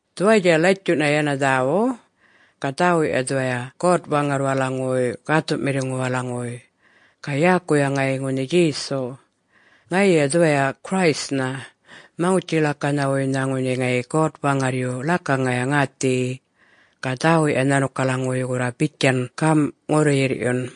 Dhuwayatja latjuꞌna yana dhäwuꞌ. Ga dhäwuꞌya dhuwaya God-Waŋarrwalaŋuwuy Gäthuꞌmiŋuwalaŋuwuy, ga yäkuya ŋayi ŋunhi Djesu. Ŋayiya dhuwaya Christnha, Maŋutji-ḻakanhawuynha ŋunhi ŋayi God-Waŋarryu ḻakaŋaya ŋäthiyi. Ga dhäwuꞌya nhanukalaŋuwuy gurra bitjan gamꞌ ŋurru-yirrꞌyun: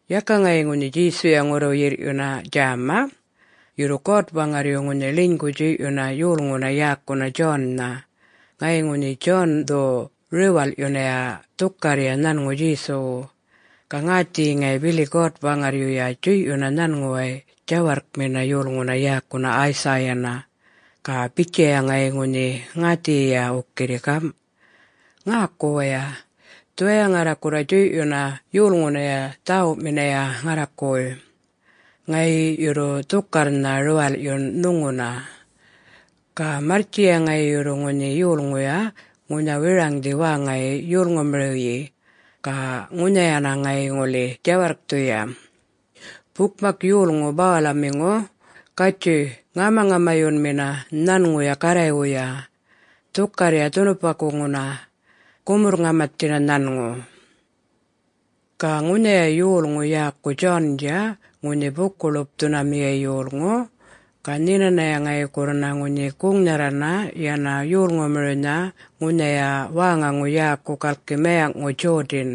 Yaka ŋayi ŋunhi Djesuya ŋurru-yirrꞌyuna djäma, yurru God-Waŋarryu ŋunhi ḻinygu djuyꞌyuna yolŋuna yäkuna John-na. Ŋayi ŋunhi John-dhu riwalꞌyunaya dhukarrya nhanŋu Djesuwu. Ga ŋäthiyi ŋayi bili God-Waŋarryuya djuyꞌyuna nhanŋuway djawarrkmina yolŋuna yäkuna Isaiah-na. Ga bitjaya ŋayi ŋunhi ŋäthiyiya wukirri gamꞌ: “Ŋäku waya! Dhuwaya ŋarra gurra djuyꞌyuna yolŋunaya dhäwuꞌminaya ŋarrakuway. Ŋayi yurru dhukarrnha riwalꞌyun nhuŋuna. Ga marrtjiya ŋayi yurru ŋunhi yolŋuya ŋunha wiraŋdhi wäŋayi yolŋumiriwyi ga ŋunhayana ŋayi ŋuli djawarrkthuya, ‘Bukmak yolŋu bawalamiŋu, gatjuy ŋamaŋamayunmina nhanŋuya Garraywuya. Dhukarrya dhunupakuŋuna, gumurr-ŋamathina nhanŋu.’” Ga ŋunhiya yolŋu yäku John-dja ŋunhi Buku-ḻupthunamiya yolŋu. Ga nhinanaya ŋayi gurrana ŋunhi guŋnharrana yana yolŋumiriwnha ŋunhaya wäŋaŋu yäkuŋu galki mayaŋꞌŋu Jordan.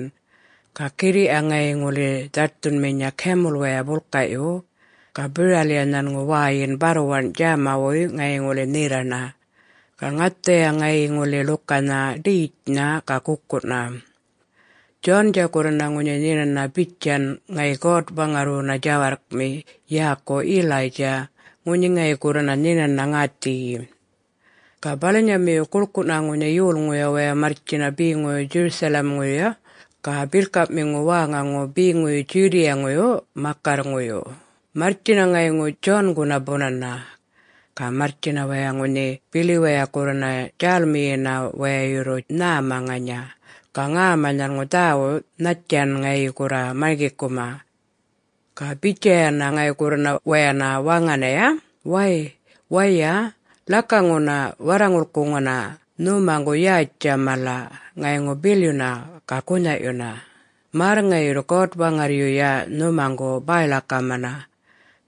Ga girriꞌya ŋayi ŋuli dhaṯthunminya camel-waya bulkaꞌyu, ga biralꞌya nhanŋu wäyin barrwaṉ djämawuy ŋayi ŋuli nherraṉa. Ga ŋathaya ŋayi ŋuli ḻukanha ḏetjnha ga gukuna. [John-dja gurrana ŋunhi nhinana bitjan ŋayi God-Waŋarrwuna djawarrkmi yäku Elijah ŋunhi ŋayi gurrana nhinana ŋäthiyi.] Ga balanyamiyu, guḻkuꞌna ŋunhi yolŋuya waya marrtjina beŋuyu Jerusalem-ŋuyu ga birrkaꞌmiŋu wäŋaŋu beŋuyu Judea-ŋuyu makarrŋuyu, marrtjina ŋayŋu John-guna bunana. Ga marrtjina waya ŋunhi, bili waya gurrana djälmiyina waya yurru nhäma ŋanya, ga ŋäma nhanŋu dhäwuꞌ nhattjan ŋayi gurra marŋgikuma. Ga bitjayana ŋayi gurrana wayana waŋanaya, “Way, waya, ḻakaŋuna warraŋulkuŋuna nhumaŋgu yätjtja mala, ŋayŋu bilyuna, ga gunhaꞌyuna, märr ŋayi yurru God-Waŋarryuya nhumaŋgu bäy-ḻakamana.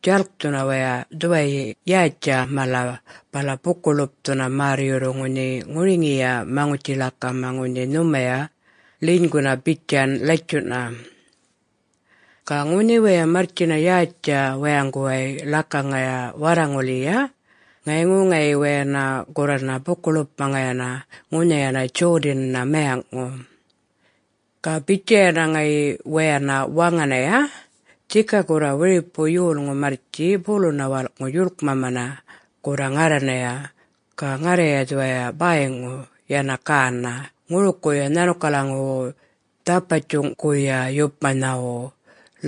Djalkthuna waya dhuwayi yätjtja mala bala buku-ḻupthuna märr yurru ŋunhi ŋuriŋiya maŋutji-ḻakama ŋunhi nhumaya ḻinyguna bitjan latjuꞌna.” Ga ŋunhi waya marrtjina yätjtja wayaŋguway ḻakaŋaya warraŋulyiya, ŋayŋu ŋayi wayana gurrana buku-ḻupꞌmaŋayana ŋunhayana Jordan-na mayaŋꞌŋu. Ga bitjayana ŋayi wayana waŋanaya, “Dhika gurra wiripu yolŋu marrtji buluna walꞌŋu djuḻkmamana gurra ŋarranaya. Ga ŋarraya dhuwaya bäyŋu yana ganaꞌ ŋurukuya nhanukalaŋuwu dhapatjuŋguya yupmanhawu,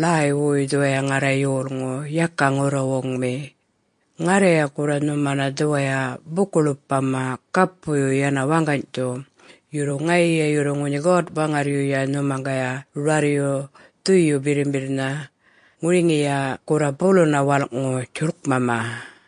ḻäywuy dhuwaya ŋarra yolŋu, yaka ŋurruwuŋmi. Ŋarraya gurra nhumana dhuwaya buku-ḻupmama gapuyu yana waŋganydhu. Yurru, ŋayiya yurru ŋunhi God-Waŋarryuya nhumaŋgaya rarryu Dhuyu Birrimbirrnha, ŋuriŋiya gurra buluna walꞌŋu djuḻkmama.”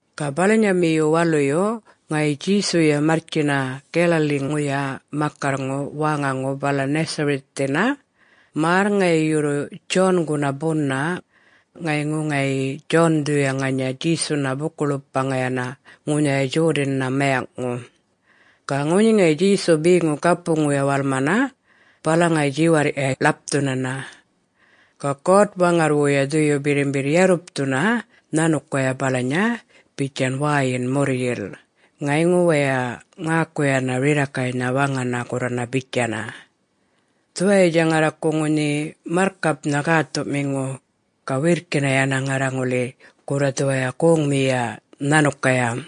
Ga balanyamiyu waluyu, ŋayi Djesuya marrtjina Galilee-ŋuya makarrŋu wäŋaŋu yäkuŋu Nazareth-ŋu, märr ŋayi yurru John-guna buna. Ŋayŋu ŋayi John-dhuya ŋanya Djesuna buku-ḻupmaŋayana ŋunhaya Jordan-na mayaŋꞌŋu. Ga ŋunhi ŋayi Djesu beŋu gapuŋuya walmana, bala ŋunhi djiwarrꞌya ḻapthunana. Ga God-Waŋarrwuya Dhuyu Birrimbirr yarrupthuna nhanukaya balanya bitjan wäyin murryil. Ŋayŋu waya ŋäkuyana rirrakaynha waŋana gurrana bitjaya, “Dhuwayatja ŋarraku ŋunhi marrkapnha gäthuꞌmiŋu. Ga wirrkina yana ŋarra ŋuli gurra dhuwaya goŋmiyiya nhanukaya.”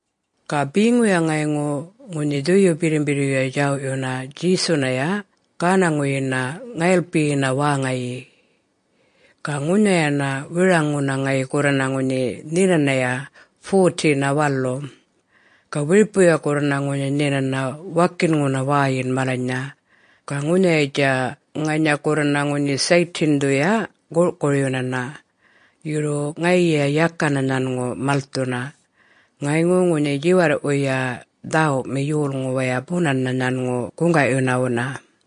Ga beŋuya ŋayŋu ŋunhi Dhuyu Birrimbirryuya djawꞌyuna Djesunaya gänaŋuyina ŋayilpiyina wäŋayi. Ga ŋunhayana wiraŋŋuna ŋayi gurrana ŋunhi nhinanaya 40-na walu. Ga wiripuya gurrana ŋunhi nhinana wakinŋuna wäyin malanynha. Ga ŋunhayatja ŋanya gurrana ŋunhi Satan-dhuya gurꞌkuryunana. Yurru ŋayiya yaka nhanŋu malthuna. Ŋayŋu ŋunhi djiwarrꞌwuyya dhäwuꞌmi yolŋu waya bunana nhanŋu guŋgaꞌyunawuna.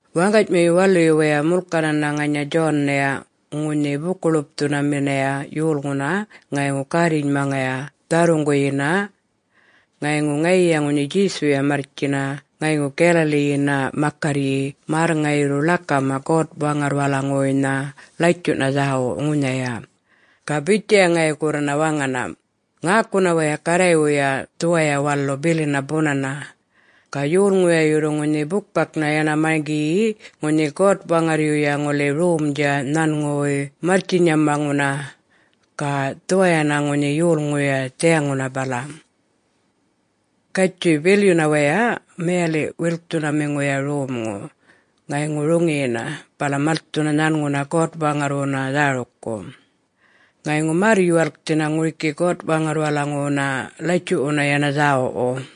Waŋganymiyu waluyu waya mulkanana ŋanya John-naya ŋunhi Buku-ḻupthunaminaya yolŋuna ŋayŋu gärrinymaŋaya dharruŋguyina. Ŋayŋu ŋayiya ŋunhi Djesuya marrtjina ŋayŋu Galilee-yina makarryi, märr ŋayi yurru ḻakama God-Waŋarrwalaŋuwuynha latjuꞌna dhäwu ŋunhaya. Ga bitjaya ŋayi gurrana waŋana, “Ŋäkuna waya! Garraywuya dhuwaya walu bilina bunana! Ga yolŋuya yurru ŋunhi bukmaknha yana marŋgiyi ŋunhi God-Waŋarryuya ŋuli romdja nhanŋuway marrtjinyamaŋuna, ga dhuwayana ŋunhi yulŋuya dhiyaŋuna bala. Gatjuy, bilyuna waya mayaliꞌ-wilkthunamiŋuya romŋu, ŋayŋu roŋiyina, bala malthuna nhanŋuna God-Waŋarrwuna dhärukku. Ŋayŋu märr-yuwalkthina ŋuriki God-Waŋarrwalaŋuwuna latjuꞌwuna yana dhäwuꞌwu.”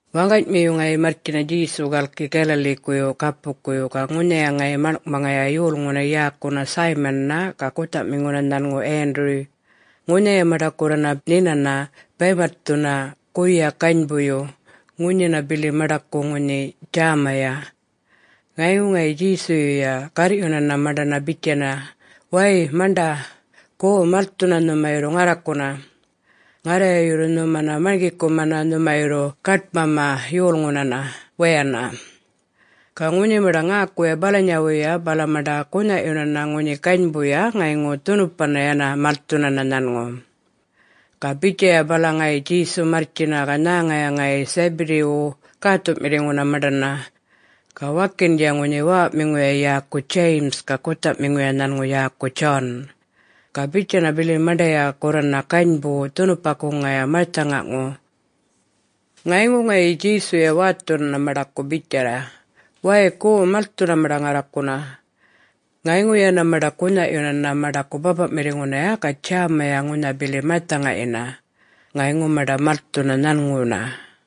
Waŋganymiyu ŋayi marrtjina Djesu galki Galilee-kuyu gapukuyu ga ŋunhaya ŋayi maḻŋꞌmaŋaya yolŋuna yäkuna Simon-na ga guthaꞌmiŋu nhanŋu Andrew. Ŋunhaya maṉḏa gurrana nhinana baymatthuna guya ganybuyu. Ŋunhina bili maṉḏaku ŋunhi djämaya. Ŋayŋu ŋayi Djesuyuya garrꞌyunana maṉḏana bitjayana, “Wäy, maṉḏa, go! Malthuna nhuma yurru ŋarrakuna. Ŋarraya yurru nhumana marŋgikumana nhuma yurru gaṯmama yolŋunana wayana.” Ga ŋunhi maṉḏa ŋäkuya balanyawuya bala maṉḏa gunhaꞌyunana ŋunhi ganybuya ŋayŋu dhunupana yana malthunana nhanŋu. Ga bitjaya bala ŋayi Djesu marrtjina ga nhäŋaya ŋayi Zebedee-wu gäthuꞌmiŋuna maṉḏana. Ga wakindja ŋunhi wäwaꞌmiŋuya yäku James ga guthaꞌmiŋuya nhanŋu yäku John. Ga bitjana bili maṉḏaya gurrana ganybu dhunupakuŋaya marthaŋaŋu. Ŋayŋu ŋayi Djesuya wäthunana maṉḏaku bitjaya, “Way, go, malthuna maṉḏa ŋarrakuna!” Ŋayŋu yana maṉḏa gunhaꞌyunana maṉḏaku bäpaꞌmiŋunaya ga djämaya ŋunha bili marthaŋayina. Ŋayŋu maṉḏa malthuna nhanŋuna.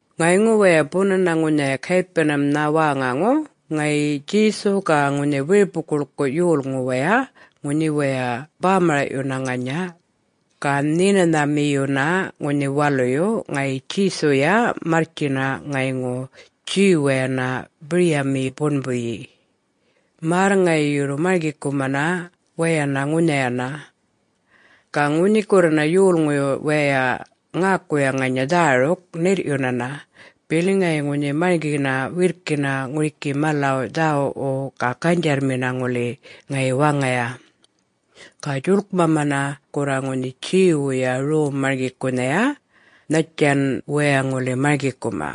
Ŋayŋu waya bunana ŋunhaya Capernaum-nha wäŋaŋu, ŋayi Djesu ga ŋunhi wiripu-guḻkuꞌ yolŋu waya ŋunhi waya bämaraꞌyuna ŋanya. Ga Nhinanhamiyuna ŋunhi Waluyu, ŋayi Djesuya marrtjina ŋayŋu Jew-wayana biryamiyi buṉbuyi, märr ŋayi yurru marŋgikumana wayana ŋunhayana. Ga ŋunhi gurrana yolŋuy wayay ŋäkuya ŋanya dhäruk, ṉirryunana, bili ŋayi ŋunhi marŋgina wirrkina ŋuriki malaw dhäwuꞌwu ga ganydjarrmina ŋuli ŋayi waŋaya. Ga djuḻkmamana gurra ŋunhi Jew-wuya rom-marŋgikunhaya nhattjan waya ŋuli marŋgikuma.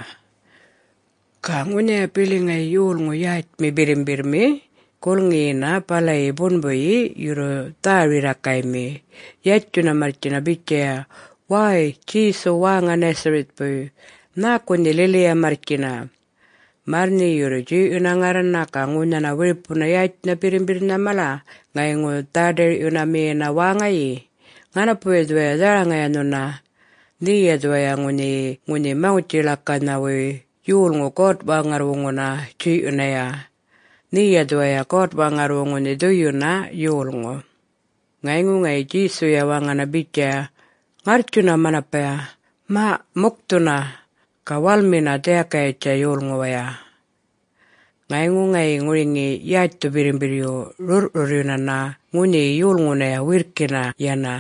Ga ŋunhaya bili ŋayi yolŋu yätjmi birrimbirrmi gulŋiyina balayi buṉbuyi yurru dhä-rirrakaymi, yatjuna marrtjina bitjaya, “Wäy, Djesu wäŋa Nazareth-puy, nhäku nhe lili-ya marrtjina? Märr nhe yurru djuyꞌyuna ŋarrana ga ŋunha wiripuna yätjnha birrimbirrinha mala ŋayŋu dhä-ḏirꞌyunamiyina wäŋayi? Ŋanapuya dhuwaya dharaŋaya nhuna, nheya dhuwaya ŋunhiyi ŋunhi Maŋutji-ḻakanhawuy yolŋu God-Waŋarrwuŋuna djuyꞌyunaya. Nheya dhuwaya God-Waŋarrwu ŋunhi Dhuyunha Yolŋu.” Ŋayŋu ŋayi Djesuya waŋana bitjaya, ŋarrtjuna manapaya, “Maꞌ, mukthuna, ga walmina dhiyakayatja yolŋuwaya!” Ŋayŋu ŋayi ŋuriŋi yätjthu birrimbirryu rurrꞌrurryunana ŋunhiyi yolŋunaya wirrkina yana.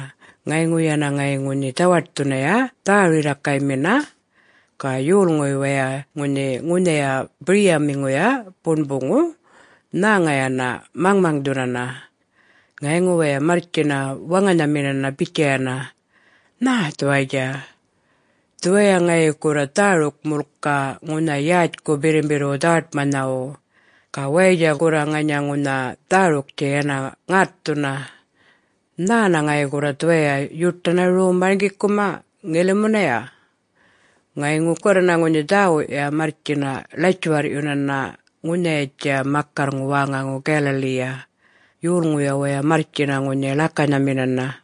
Ŋayŋu yana ŋayi ŋunhi dhawaṯthunaya dhä-rirrakaymina. Ga yolŋuy wayay ŋunhi ŋunhaya biryamiŋuya buṉbuŋu nhäŋayana maŋmaŋdhunana. Ŋayŋu waya marrtjina waŋanhaminana bitjayana, “Nhä dhuwayatja? Dhuwaya ŋayi gurra dhäruk-mulka ŋunha yätjku birrimbirrwu dhawaṯmanhawu, ga wayatja gurra ŋanya ŋunha dhäruktja yana ŋätthuna. Nhäna ŋayi gurra dhuwaya yuṯana rom marŋgikuma ŋilimunaya?” Ŋayŋu gurrana ŋunhi dhäwuꞌya marrtjina ḻatjuwarrꞌyunana ŋunhayatja makarrŋu wäŋaŋu Galilee-ya. Yolŋuya waya marrtjina ŋunhi ḻakanhaminana.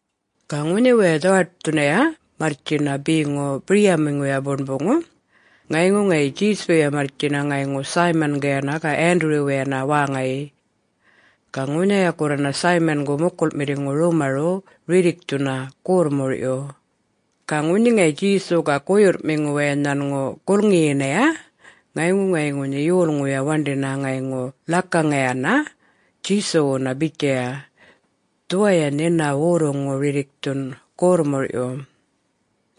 Ga ŋunhi waya dhawaṯthunaya marrtjina beŋu biryamiŋuya buṉbuŋu, ŋayŋu ŋayi Djesuya marrtjina ŋayŋu Simon-gayana ga Andrew-wayana wäŋayi. Ga ŋunhaya gurrana Simon-gu mukulꞌmiŋu rumaruꞌ rirrikthuna gorrmurꞌyu. Ga ŋunhi ŋayi Djesu ga guyurrꞌmiŋu waya nhanŋu gulŋiyinaya, ŋayŋu ŋayi ŋunhi yolŋuya waṉḏina ŋayŋu ḻakaŋayana Djesuwuna bitjaya, “Dhuwaya nhina worruŋu rirrikthun gorrmurꞌyu.”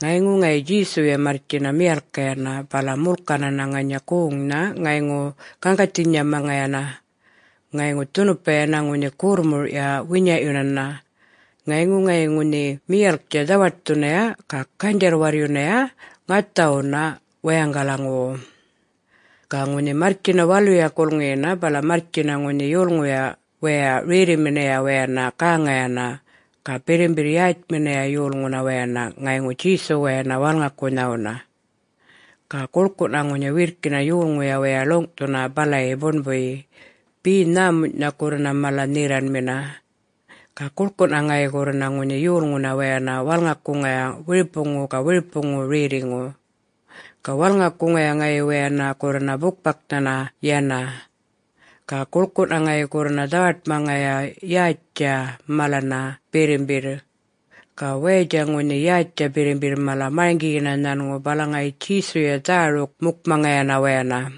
Ŋayŋu ŋayi Djesuya marrtjina miyalkkayana, bala mulkanana ŋanya goŋnha ŋayŋu gaŋgathinymaŋayana. Ŋayŋu dhunupa yana ŋunhi gorrmurꞌya winyaꞌyunana. Ŋayŋu ŋayi ŋunhi miyalktja dhawaṯthunaya ga ganydjarr-warryuna ŋathawuna wayaŋgalaŋuwu. Ga ŋunhi marrtjina waluya gulŋiyina bala marrtjina ŋunhi yolŋuyuya wayay rerriminaya wayana gäŋayana ga birrimbirr yätjminaya yolŋuna wayana ŋayŋu Djesuwayana walŋakunhawuna. Ga guḻkuꞌna ŋunhi wirrkina yolŋuya waya ḻuŋꞌthuna balayi buṉbuyi, be nhämunyꞌnha gurrana mala-nherraṉmina. Ga guḻkuꞌna ŋayi gurrana ŋunhi yolŋuna wayana walŋakuŋaya, wiripuŋu ga wiripuŋu rerriŋu. Ga walŋakuŋaya ŋayi wayana gurrana bukmaknha yana. Ga guḻkuꞌna ŋayi gurrana dhawaṯmaŋaya yätjtja malana birrimbirr. Ga wayatja ŋunhi yätjtja birrimbirr mala marŋgiyina nhanŋu, bala ŋayi Djesuya dhäruk-mukmaŋayana wayana.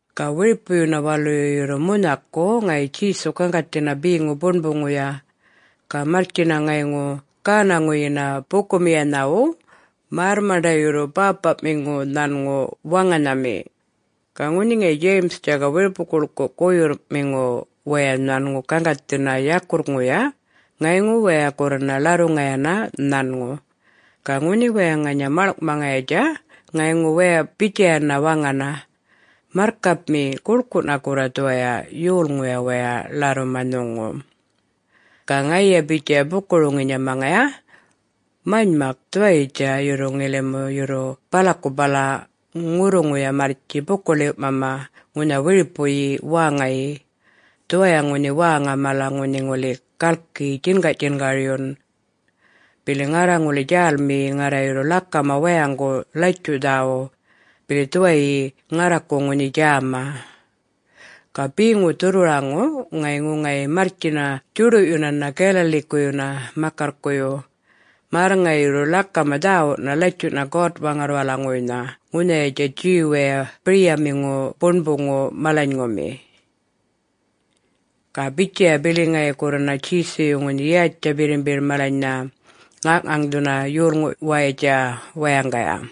Ga wiripuyuna waluyu yurru munhaku, ŋayi Djesu gaŋgathina beŋu buṉbuŋuya. Ga marrtjina ŋayŋu gänaŋuyina buku-miyanhawu märr maṉḏa yurru bäpaꞌmiŋu nhanŋu waŋanhami. Ga ŋunhi ŋayi Simon ga wiripu-guḻkuꞌ guyurrꞌmiŋu waya nhanŋu gaŋgathina yakurrŋuya ŋayŋu waya gurrana ḻarruŋayana nhanŋu. Ga ŋunhi waya ŋanya maḻŋꞌmaŋayatja ŋayŋu waya bitjayana waŋana, “Marrkapmi, guḻkuꞌna gurra dhuwaya yolŋuya waya ḻarruma nhuŋu.” Ga ŋayiya bitjaya buku-roŋinymaŋaya, “Manymak dhuwayitja. Yurru ŋilimu yurru balaku bala ŋurruŋuya marrtji buku-ḻiwꞌmama ŋunha wiripuyi wäŋayi. Dhuwaya ŋunhi wäŋa mala ŋunhi ŋuli galki djingaꞌ-djingaryun. Bili ŋarra ŋuli djälmiyi ŋarra yurru ḻakama wayaŋgu Latjuꞌ Dhäwuꞌ, bili dhuwayyi ŋarraku ŋunhi djämaya.” Ga beŋu dhurrwaraŋu, ŋayŋu ŋayi marrtjina djuḏuꞌyunana Galilee-kuyuna makarrkuyu, märr ŋayi yurru ḻakama dhäwuꞌna latjuꞌna God-Waŋarrwalaŋuwuynha ŋunhayatja Jew-waya biryamiŋu buṉbuŋu malanyŋumi. Ga bitjaya bili ŋayi gurrana Jesuyu ŋunhi yätjtja birrimbirr malanynha ŋaŋꞌŋaŋdhuna yolŋuwayatja wayaŋgaya.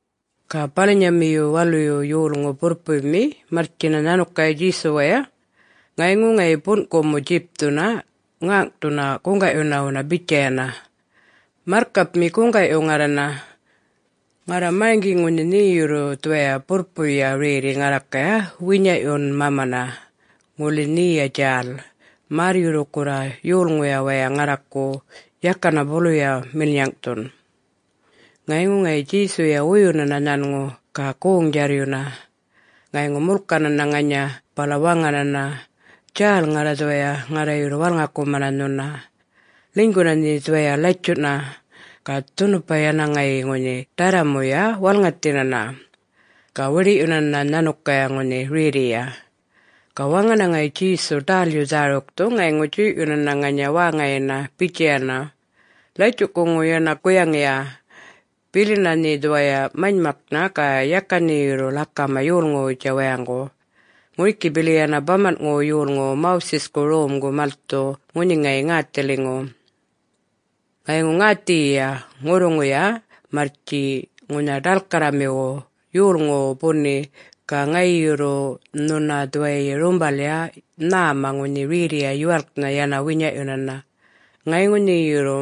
Ga balanyamiyu waluyu yolŋu burrpuymi marrtjina nhanukaya Djesuwaya. Ŋayŋu ŋayi bunꞌkumu djipthuna ŋäŋꞌthuna guŋgaꞌyunawu bitjayana, “Marrkapmi, guŋgaꞌyu ŋarrana! Ŋarra marŋgi ŋunhi nhe yurru dhuwaya burrpuya rerri ŋarrakaya winyaꞌyunmamana, ŋuli nheya djäl, märr yurru gurra yolŋuya waya ŋarraku yakana buluya milnyaŋꞌthun.” Ŋayŋu ŋayi Djesuya wuyunana nhanŋu ga goŋ-djarryuna, ŋayŋu mulkanana ŋanya bala waŋanana, “Djäl ŋarra dhuwaya, ŋarra yurru walŋakumana nhuna. Ḻinyguna nhe dhuwaya latjuꞌna!” Ga dhunupana yana ŋayi ŋunhi ḏarramuya walŋathinana, ga wiḏiꞌyunana nhanukaya ŋunhi rerriya. Ga waŋana ŋayi Djesu ḏälyu dhärukthu ŋayŋu djuyꞌyunana ŋanya wäŋayina bitjayana, “Latjuꞌkuŋu yana guyaŋiya! Bilina nhe dhuwaya manymaknha ga yaka nhe yurru ḻakama yolŋuwutja wayaŋgu. Ŋuriki bili yana bamanꞌŋuwu yolŋuwu Moses-ku romgu malthu ŋunhi ŋayi ŋäthiliŋu. Ŋayŋu ŋäthiyiya ŋurruŋuya marrtji ŋunha ḏalkarramiwu yolŋuwu buni ga ŋayi yurru nhuna dhuwayi rumbalya nhäma ŋunhi rerriya yuwalknha yana winyaꞌyunana. Ŋayŋu nhe yurru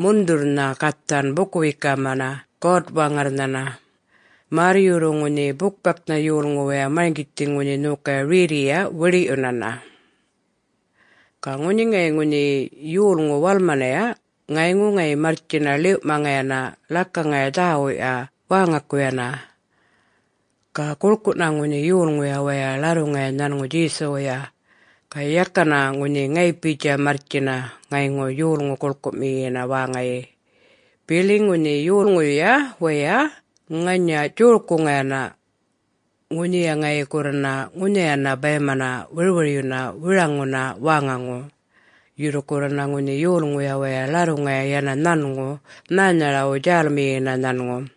mundhurrnha gathan buku-wekama God-Waŋarrnhana, märr yurru ŋunhi bukmaknha yolŋu waya marŋgithi ŋunhi nhokaya rerriya wiḏiꞌyunana.” Ga ŋunhi ŋayi ŋunhiyi yolŋu walmanaya ŋayŋu ŋayi marrtjina ḻiwꞌmaŋayana ḻakaŋaya dhäwuꞌya wäŋakuyuna. Ga guḻkuꞌna ŋunhi yolŋuya waya ḻarruŋaya nhanŋu Djesuwuya. Ga yakana ŋunhi ŋayipitja marrtjina ŋayŋu yolŋu guḻkuꞌmiyiya wäŋayi, bili ŋunhi yolŋuyuya wayay ŋanya djorkuŋayana, ŋunhiya ŋayi gurrana ŋunhayana bäymana wirwiryuna wiraŋŋuna wäŋaŋu. Yurru gurrana ŋunhi yolŋuya waya ḻarruŋaya yana nhanŋu, nhänharawu djälmiyina nhanŋu.